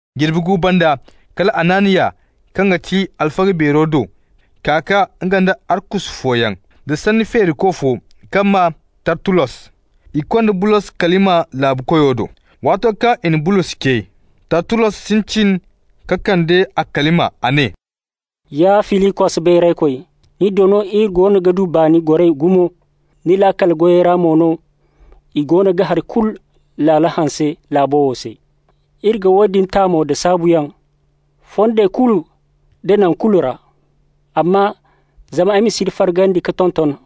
Jirbi gu banda, kala Hananiya kaŋ ga ti alfaga beero do ka kaa, nga nda arkusu fooyaŋ, da sanni feeriko fo kaŋ maa Tartullos. I konda Bulos kalima laabukoyo do. Waato kaŋ i na Bulos ce, Tartullos sintin ka kande a kalima. A ne: «Ya Filikos beeraykoy, ni do no iri goono ga du baani goray gumo. Ni laakal goyey ra mo no, i goono ga hari laalo kulu hanse laabo wo se. Iri ga woodin ta mo da saabuyaŋ, fondey kulu da naŋ kulu ra. Amma zama ay ma si ni fargandi ka tonton,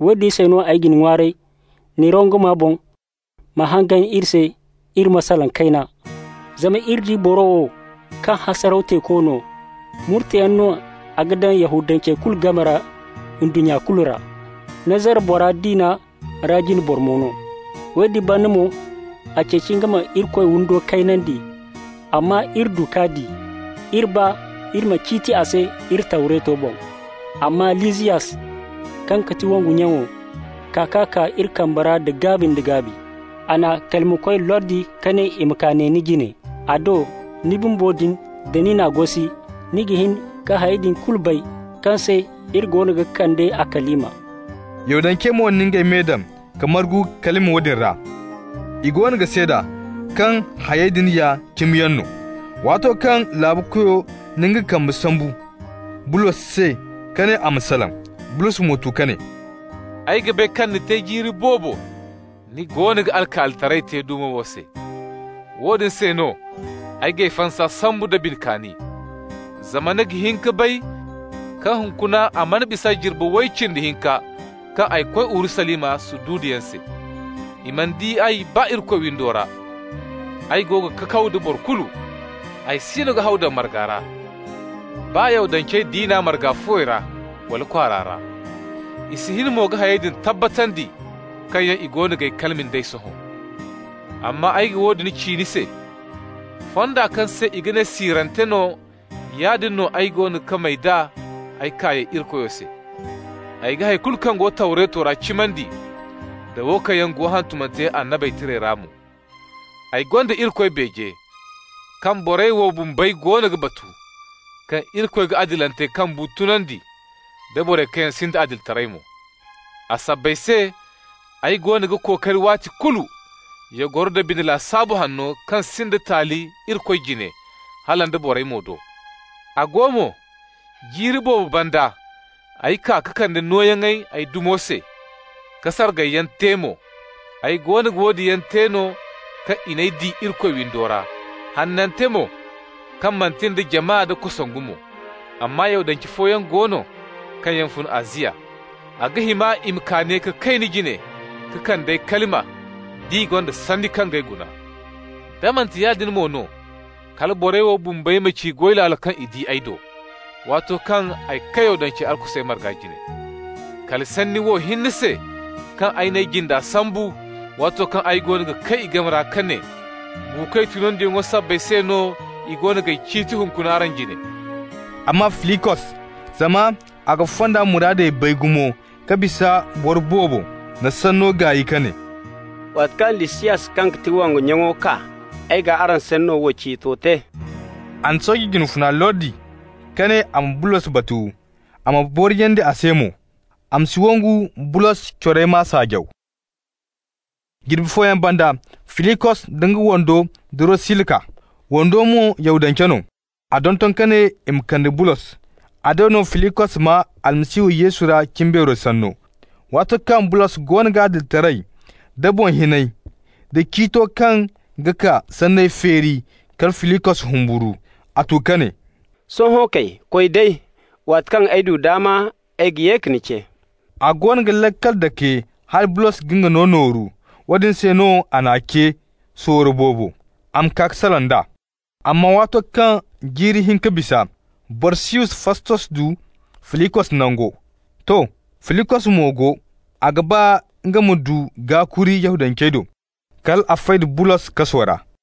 woodin se no ay ga ni ŋwaaray, ni rongoma boŋ, ma hangan iri se, iri ma salaŋ kayna. Zama iri di boro wo, kaŋ hasaraw teeko no, murteyaŋ no a ga daŋ Yahudancey kulu game ra ndunnya kulu ra. Nazara bora diina ra jine boro mo no. Woodin banda mo, a ceeci nga ma Irikoy windo kaynandi. Amma iri du k'a di, iri ba iri ma ciiti a se iri Tawreto boŋ. Amma Lisiyas, kaŋ ga ti wongu nyaŋo, kaa k'a kaa iri kambe ra da gaabi nda gaabi. A n'a kalimakoy lordi ka ne i ma kaa ne ni jine. A do, ni bumbo din, da ni n'a gosi, ni ga hin ka hayey din kulu bay kaŋ se iri goono ga kande a kalima.» Yahudancey mo na ngey me daŋ ka margu kalima woodin ra. I goono ga seeda kaŋ hayey din ya cimiyaŋ no. Waato kaŋ laabukoyo na nga kambe sambu Bulos se ka ne a ma salaŋ, Bulos mo tu ka ne: «Ay ga bay kaŋ ni te jiiri boobo ni goono ga alkaalitaray te dumo wo se. Woodin se no ay g'ay fansa sambu da bine kaani. Zama ni ga hin ka bay kaŋ hunkuna a mana bisa jirbi way cindi hinka kaŋ ay koy Urusalima sududuyaŋ se. I mana di ay baa Irikoy windo ra, ay go ga kakaw da boro kulu. Ay siino ga haw daŋ marga ra, baa Yahudance diina marga fuwey ra, wala kwaara ra. I si hin mo ka hayey din tabbatandi kaŋ yaŋ i goono g'ay kalima nd'ey sohõ. Amma ay ga woodin ci ni se: Fonda kaŋ se i ga ne siirante no, yaadin no ay goono ga may d'a ay kaayey Irikoyo se. Ay ga hay kulu kaŋ go Tawreto ra cimandi, da wo kaŋ yaŋ go hantumante Annabey Tirey ra mo. Ay gonda Irikoy beeje, kaŋ borey wo bumbey goono ga batu: kaŋ Irikoy ga adilantey kaŋ bu tunandi, da borey kaŋ yaŋ sinda adilitaray mo. A sabbay se ay goono ga kookari waati kulu ya goro nda bine lasaabu hanno kaŋ sinda taali Irikoy jine, hala nda borey mo do. A go mo, jiiri boobo banda, ay kaa ka kande nooyaŋey ay dumo se, ka sargayyaŋ te mo. Ay goono ga woodin yaŋ te no, kaŋ i di ay Irikoy windo ra, hanante mo, kaŋ manti nda jama da kosongu mo. Amma Yahudance fooyaŋ go no kaŋ yaŋ fun Aziya. A ga hima i ma kaa ne ka kay ni jine ka kande ay kalima, d'i gonda sanni kaŋ g'ay guna. Da manti yaadin mo no, kala borey wo bumbey ma ci goy laalo kaŋ i di ay do, waato kaŋ ay kay Yahudancey arkusey marga jine. Kala sanni wo hinne se, kaŋ ay n'ay jinde sambu, waato kaŋ ay goono ga kay i game ra, ka ne: ‹Buukoy tunandiyaŋo sanni sabbay se no, i goono g'ay ciiti hunkuna araŋ jine.›» Amma Filikos, zama a ga Fonda muraadey bay gumo ka bisa boro boobo, na sanno gaay ka ne: «Waati kaŋ Lisiyas kaŋ ga ti wongu nyaŋo kaa, ay g'araŋ sanno wo ciito te.» A na sooje jine funa lordi ka ne a ma Bulos batu, a ma boriyandi a se mo, a ma si wangu Bulos corey m'a saajaw. Jirbi fooyaŋ banda, Filikos da nga wando Durosila kaa, wando mo Yahudance no. A donton ka ne i ma kande Bulos. A do no Filikos maa Almasihu Yesu ra cimbeero sanno. Waato kaŋ Bulos goono ga adilitaray da boŋ hinay da ciito kaŋ ga kaa sanney feeri, kala Filikos humburu. A tu ka ne: «Sohõ kay, koy day! Waati kaŋ ay du daama, ay ga ye ka ni ce.» A goono ga laakal dake hala Bulos ga nga no nooru. Woodin se no a n'a ce sorro boobo, a ma kaa ka salaŋ d'a. Amma waato kaŋ jiiri hinka bisa, Borsiyus Fastos du Filikos nango. To, Filikos mo go, a ga ba nga ma du gaakuri Yahudancey do, kal a fay da Bulos kaso ra.